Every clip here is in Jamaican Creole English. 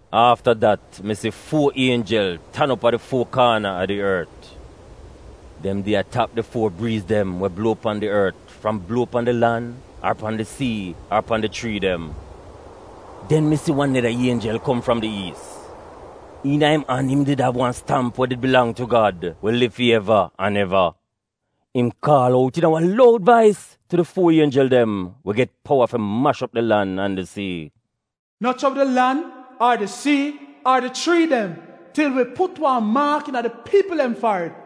Afta dat mi si fuo ienjel tan op a di fuo kaana a di ort. Dem did a tap di fuo briiz dem we bluo pan di ort fram bluo pan di lan ar pan di sii ar pan di chrii dem. Den mi si wan neda ienjel kom fram di iis. Iina im an, im did av wan stamp we did bilang tu Gad we liv fi eva an eva. Im kaal out iina wan loud vais tu di fuo ienjel dem we get powa fi mash op di lan an di sii: “No chobl di lan ar di sii ar di chrii dem til wi put wan maak iina fi wi Gad piipl dem farid.”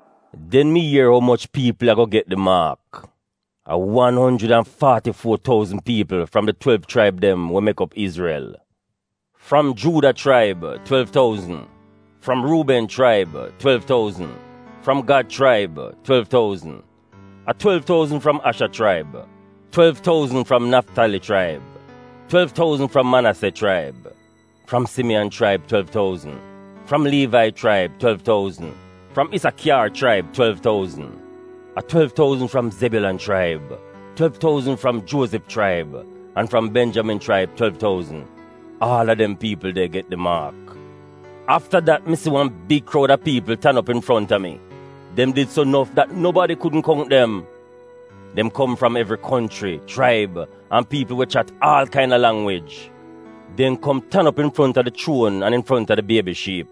Den mi ier umoch piipl ago get di maak. A wan onjrid an faati-fuo touzn piipl fram di twelv chraib dem we mek op Izrel. Fram Juuda chraib, twelv touzn, fram Ruuben chraib twelv touzn, fram Gad chraib twelv touzn. A twelv touzn fram Asha chraib, twelv touzn fram Naftali chraib, twelv touzn, fram Manase chraib. Fram Simiyan chraib twelv touzn, fram Liivai chraib twelv touzn, fram Isakyar chraib twelv touzn. A twelv touzn fram Zebyulan chraib, twelv touzn fram Juozif chraib, an fram Benjamin chraib twelv touzn. Aal a dem piipl de get di maak. Afta dat mi si wan big kroud a piipl tan op infronta mi, dem did so nof dat nobadi kudn kount dem. Dem kom fram evri konchri, chraib, an piipl we chat aal kaina langwij. Dem kom tan op infronta di chuon an infronta di Biebi Shiip.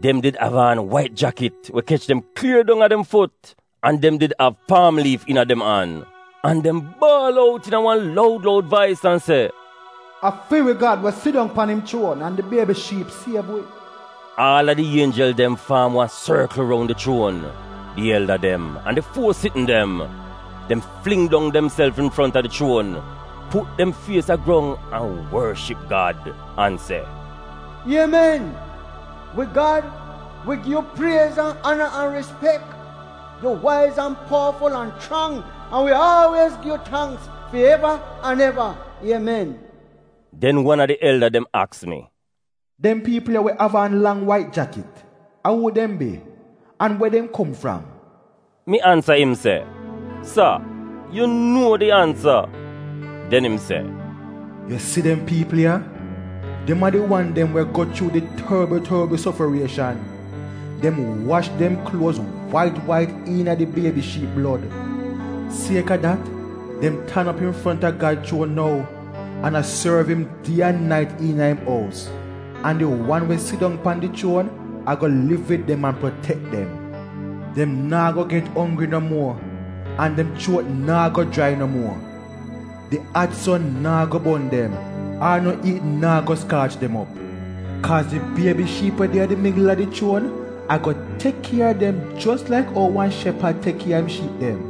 Dem did av aan wait jakit we kech dem klier dong a dem fut, an dem did av paam liif iina dem an. An dem baal out iina wan loud loud vais an se: “A fi wi Gad we sidong pan im chuon an di Biebi Shiip siev wi.” Aal a di ienjel dem faam wan sorkl roun di chuon, di elda dem, an di fuo sitn dem. Dem fling dong demself infronta di chuon, put dem fies a grong an worship Gad an se: Iemen! Wi Gad, wi gi yu priez an ana an rispek. Yu waiz, an powaful an chrang an wi aalwiez gi yu tangk fi eva an eva. Iemen!” Den wan a di elda dem aks mi, “Dem piipl ya we av aan lang wait jakit — a uu dem bi, an we dem kom fram?” Mi ansa im se, “Sa, yu nuo di ansa.” Den im se, “Yu si dem piipl ya, dem a di wan dem we go chuu di torbl torbl sofarieshan. Dem wash dem kluoz wait wait iina di Biebi Shiip blod. Sieka dat “dem tan op infronta Gad chuon nou an a sorv im die an nait iina im ous. An di wan we sidong pan di chuon ago liv wid dem an protek dem. Dem naa go get onggri no muo an dem chuot naa go jrai no muo. Di at son naa go bon dem, ar no iit naa go skaach dem op. Kaaz di Biebi Shiip we de a di migl a di chuon ago tek kier a dem jos laik ou wan shepad tek kier a im shiip dem.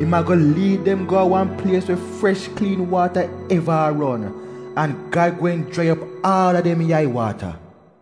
Im ago liid dem go a wan plies we fresh kliin waata eva a ron. An Gad gweehn jrai op aal a dem yai-waata.”